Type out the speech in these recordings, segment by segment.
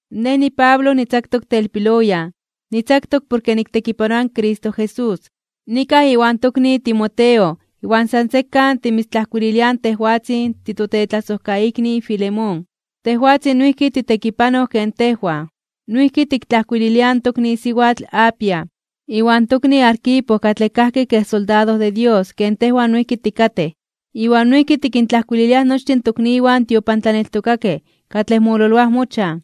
Nej niPablo, nitzaktok telpiloyan, nitzaktok porke niktekipanoa in Cristo Jesús. Nikaj iwan tokni Timoteo iwan san sekan timitztlajkuililiaj tejwatzin titotetlasojkaikni Filemón, tejwatzin noijki titekipanoj ken tejwan. Noijki tiktlajkuililiaj in tokni siwatl Apia, iwan tokni Arquipo katlej kajki kej soldado de Dios ken tejwan noijki tikatej. Iwan noijki tikintlajkuililiaj nochtin in tokniwan tiopantlaneltokakej katlej mololoaj mochan.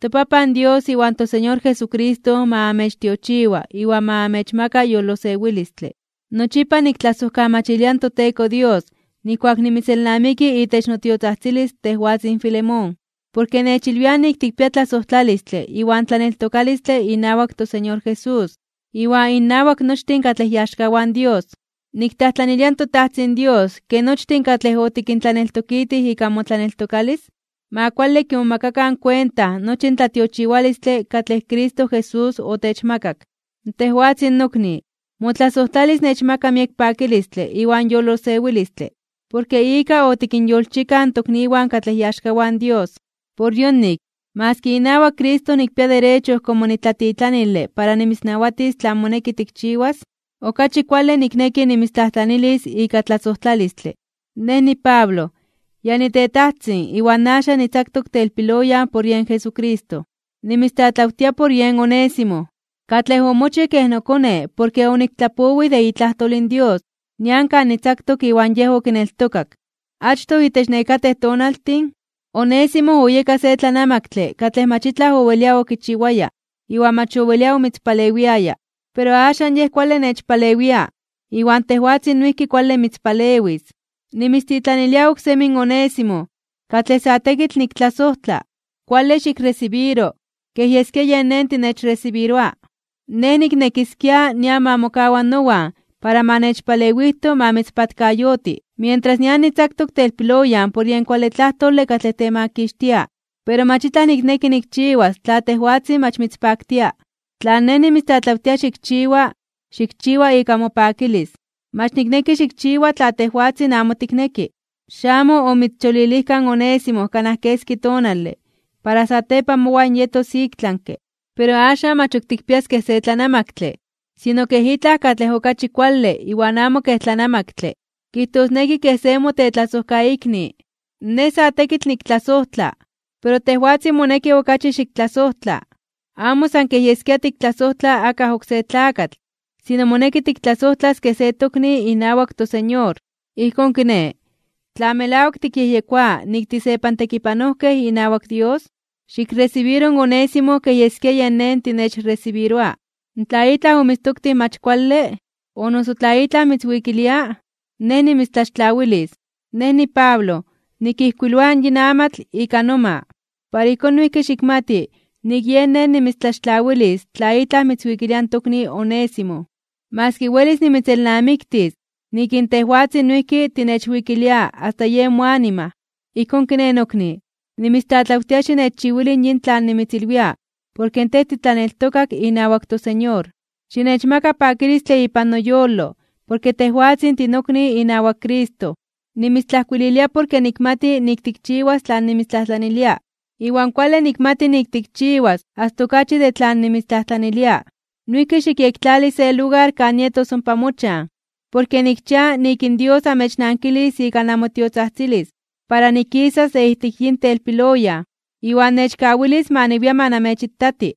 ToPapan Dios iwan toSeñor Jesucristo ma amechtiochiwa iwan ma amechmaka yolosewilistle. Nochipa niktlajsojkamachilia noTeko Dios nijkuak nimitzelnamiki itech notiotzajtzilis tejwatzin Filemón, porke nechilwiaj nik tikpia tlasojtlalistle iwan tlaneltokalistle inawak toSeñor Jesús, iwan innawak nochtin katlej iaxkawan Dios. Niktlajtlanilia toTajtzin Dios ke nochtin katlej otikintlaneltokitij ika motlaneltokalis, ma kuale kimomakakan kuenta nochi in tlatiochiwalistle katlej Cristo Jesús otechmakak. Tejwatzin nokni, motlasojtlalis nechmaka miek pakilistle iwan yolosewilistle porke ika otikinyolchikaj in tokniwan katlej iaxkawan Dios. Por yonik, maski inawak Cristo nikpia derecho komo nitlatitlanile para nimitznawatis tlan moneki tikchiwas, okachi kuale nikneki nimitztlajtlanilis ika tlasojtlalistle. Nej, niPablo, ya nitetajtzin iwan axan nitzaktok telpiloyan por yen Jesucristo. Nimitztlatlawtia por yen Onésimo, katlej omochij kej nokone porke oniktlapowij de itlajtol in Dios nian kan nitzaktok iwan yej okineltokak. Achtoj, itech nekatej tonaltin, Onésimo oyeka se tlanamaktle katlej mach itlaj owelia okichiwaya iwan mach owelia omitzpalewiaya, pero axan yej kuale nechpalewia iwan tejwatzin noijki kuale mitzpalewis. Nimitztitlanilia oksemi in Onésimo, katlej sa tekitl niktlasojtla. Kuale xikresibiro kej yeskia yen nej tinechresibiroa. Nej niknekiskia nian ma mokawa nowan para ma nechpalewijto ma mitzpatkayoti, mientras nian nitzaktok telpiloyan por yen kuale tlajtole katlej temakixtia. Pero mach itlaj nikneki nikchiwas tla tejwatzin mach mitzpaktia. Tlan nej nimitztlatlawtia xikchiwa, xikchiwa ika mopakilis, mach nikneki xikchiwa tla tejwatzin amo tikneki. Xamo omitzcholilijka in Onésimo kanaj keski tonale para satepan mowan yetos iktlanke (ik tlami), pero axan mach ok tikpias kej se tlanamaktle, sino kej itlaj katlej okachi kuale iwan amo kej tlanamaktle, kijtosneki kej se motetlasojkaikni. Nej sa tekitl niktlasojtla, pero tejwatzin moneki okachi xiktlasojtla, amo san kej yeskia tiktlasojtla akaj oksé tlakatl sino moneki tiktlasojtlas kej se tokni inawak toSeñor. Ijkón kiné, tla melawak tikyejyekoa nik tisepantekipanojkej inawak Dios, xikresibiro in Onésimo kej yeskia yen nej tinechresibiroa. Tla itlaj omitztoktij mach kuale, o noso tla itlaj mitzwikilia, nej nimitztlaxtlawilis. Nej, niPablo, nikijkuiloa yin amatl ika noma, para ijkón noijki xikmati nik yen nej nimitztlaxtlawilis tla itlaj mitzwikilia in tokni Onésimo, maski welis nimitzelnamiktis nik in tejwatzin noijki tinechwikilia asta yen moanima. Ijkón kiné, nokni, nimitztlatlawtia xinechchiwili yin tlan nimitzilwia porke tej titlaneltokak inawak toSeñor. Xinechmaka pakilistle ipan noyolo porke tejwatzin tinokni inawak Cristo. Nimitztlajkuililia porke nikmati nik tikchiwas tlan nimitztlajtlanilia, iwan kuale nikmati nik tikchiwas asta okachi de tlan nimitztlajtlanilia. Noijki xikyektlali se lugar kan nietos ompa mochan, porke nikchia nik in Dios amechnankilis ika namotiotzajtzilis para nikisas de ijtik yin telpiloyan, iwan nechkawilis ma niwia ma namechitati.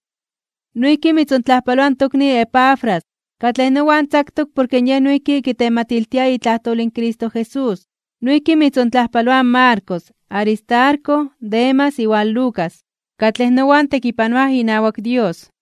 Noijki mitzontlajpaloa in tokni Epafras, katlej nowan tzaktok porke yej noijki kitematiltia itlajtol in Cristo Jesús. Noijki mitzontlajpaloaj in Marcos, Aristarco, Demas iwan Lucas, katlej nowan tekipanoaj inawak Dios.